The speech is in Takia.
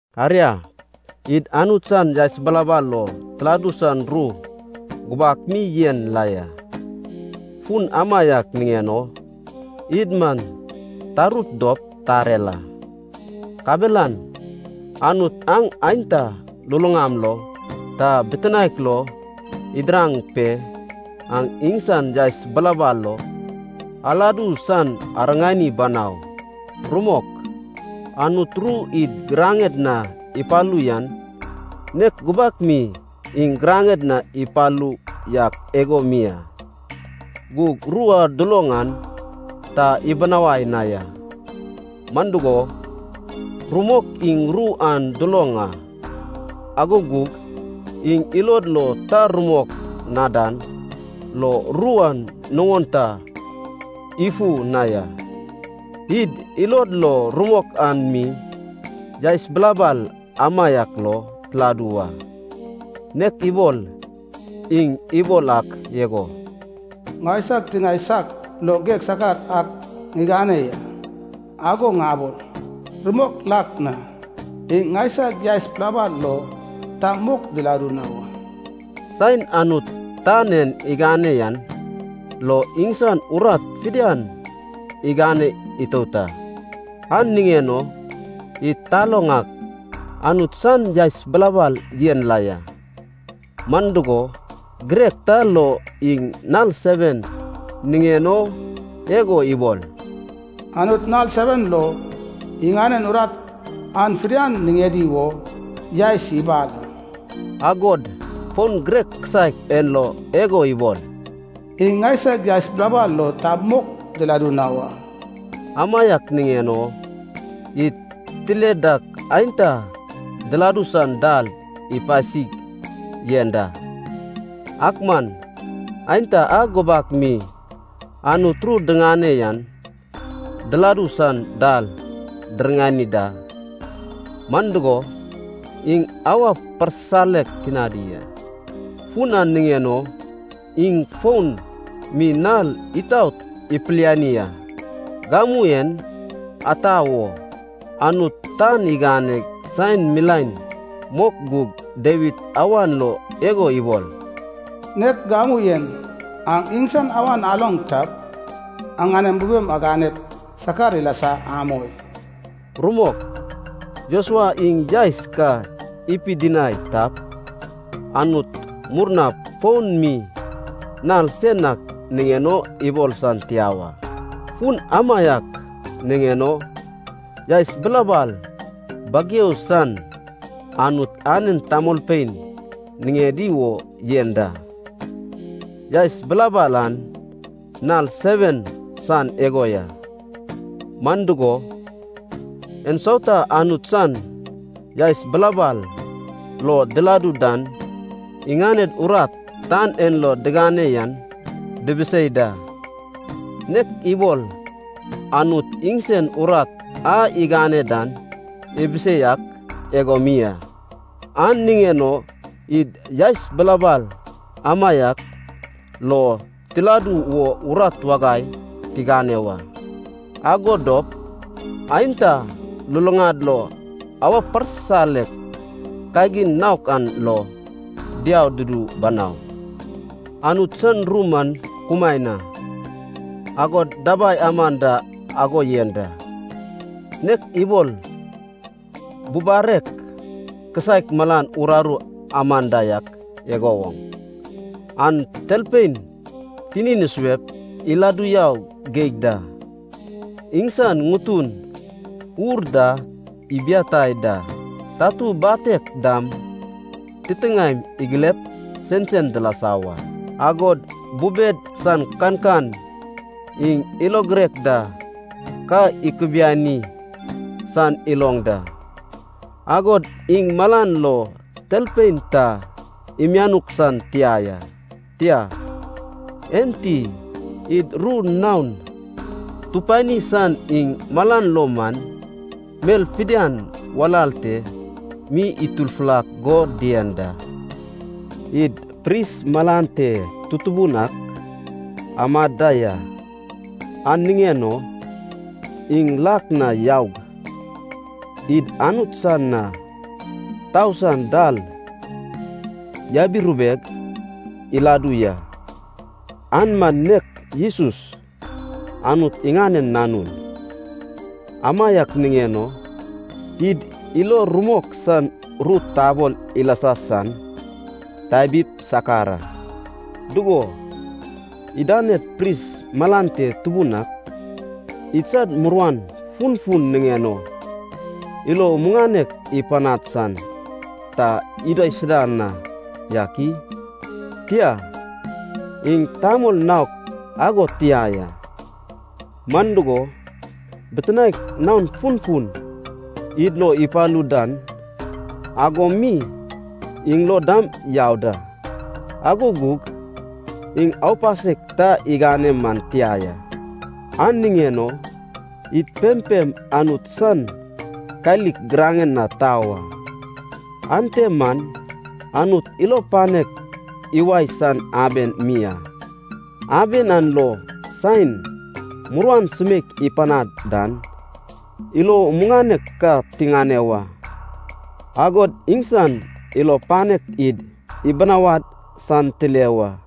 Aria, id Anut san yaes bilabal lo tiladu san ru gubak mi yen la ya. Fun amaiak niŋen o id man tarut dop tarer a. Kabelan Anut aŋ aenta luluŋam lo ta bitinaek lo idiraŋ pe, aŋ iŋsan yaes bilabal lo aladu san ariŋani banau. Rumok, Anut ru id giraŋed na ipalu yan, nek gubak mi iŋ giraŋed na ipalu yak igo mi a. Gug ru a duloŋ an ta ibinawai na ya. Man dugo, rumok iŋ ru an duloŋ a, ago gug iŋ ilod lo ta rumok na dan lo ru an nuŋon ta ifu na ya. Id ilod lo rumok an mi yaes bilabal amaiak lo tiladu wa. Nek ibol iŋ ibol ak igo, “Ŋaisag tiŋae saiak lo geg sakar ak ŋigane yan, ago ŋabol, ‘Rumok lak na, iŋ ŋaisag yaes bilabal lo ta mok diladu na wa.’” Saen Anut tan en igane yan lo iŋsan urat fidian igane itout a. An niŋen o id taloŋ ak, Anut san yaes bilabal yen la ya. Man dugo, girek ta lo iŋ nal seven niŋen o igo ibol, “Anut nal seven lo iŋanen urat an fidian niŋedi wo yaes ibal a.” Agod fon girek kisaek en lo igo ibol, “iŋ ŋaisag yaes bilabal lo ta mok diladu na wa.” Amaiak niŋen o id tile dak aenta diladu san dal ipasig yen da, ak man aenta a gubak mi Anut ru diŋane yan diladu san dal diriŋani da, man dugo, iŋ awa parsisalek tinadi a. Fun an niŋen o iŋ fon mi nal itaot ipiliani a, “gamu en”, ata wo, Anut tan iganeg saen milaen mok gug Dawid awan lo igo ibol, “Nek gamu en, aŋ iŋsan awan aloŋ tap, aŋanem bubem aganep sakar ilasa amoi.” Rumok, Josua iŋ yaes ka ipidinai tap, Anut murnap fon mi nal sen ak niŋen o ibol san tia wa. Fun amaiak niŋen o yaes bilabal bageu san Anut anen tamolpein niŋedi wo yen da, yaes bilabal an nal seven san igo ya. Man dugo, ensauta Anut san yaes bilabal lo diladu dan iŋaned urat tan en lo digane yan dibisei da, nek ibol Anut iŋsen urat a igane dan ibisei ak igo mi a. An niŋen o id yaes bilabal amaiak lo tiladu wo urat wagai tigane wa. Ago dop aenta luluŋad lo awa parsisalek kagin naok an lo diau dudu banau. Anut san ru man kumaen a, agod dabai aman da ago yen da. Nek ibol bubarek kisaek malan uraru aman da yak igo woŋ, an talpein tinin isuep iladu yau geig da, iŋsan ŋutun ur da ibiatai da, tatu batek dam titiŋaem igilep sensen dilasa wa. Agod bubed san kankan iŋ ilo girek da ka ikubiani san iloŋ da. Agod iŋ malan lo talpein ta imianuk san tia ya. Tia, enti id ru naon tupani san iŋ malan lo man, mel fidian walal te mi itufulak go dien da. Id pris malan te tutubun ak amad da ya, an niŋen o iŋ lak na yaug, id Anut san na tau san dal yabirubeg iladu ya, an man nek Jesus, Anut iŋanen Nanun. Amaiak niŋen o id ilo rumok san ru tabol ilasa san tabip sakar a. Dugo, idaned pris malan te tubun ak idsad muruan funfun niŋen o ilo muŋanek ipanad san ta idaisuda na yak i? Tia, iŋ tamol naok ago tia ya. Man dugo, bitinaek naon funfun id lo ipalu dan ago mi iŋ lo dam yau da, ago gug iŋ aupasek ta igane man tia ya. An niŋen o id pempem Anut san kalik giraŋen na tau a, ante man Anut ilo panek iwae san aben mi a. Aben an lo saen muruan sumeik ipanad dan, ilo muŋanek ka tiŋane wa, agod iŋsan ilo panek id ibinawad san tile wa.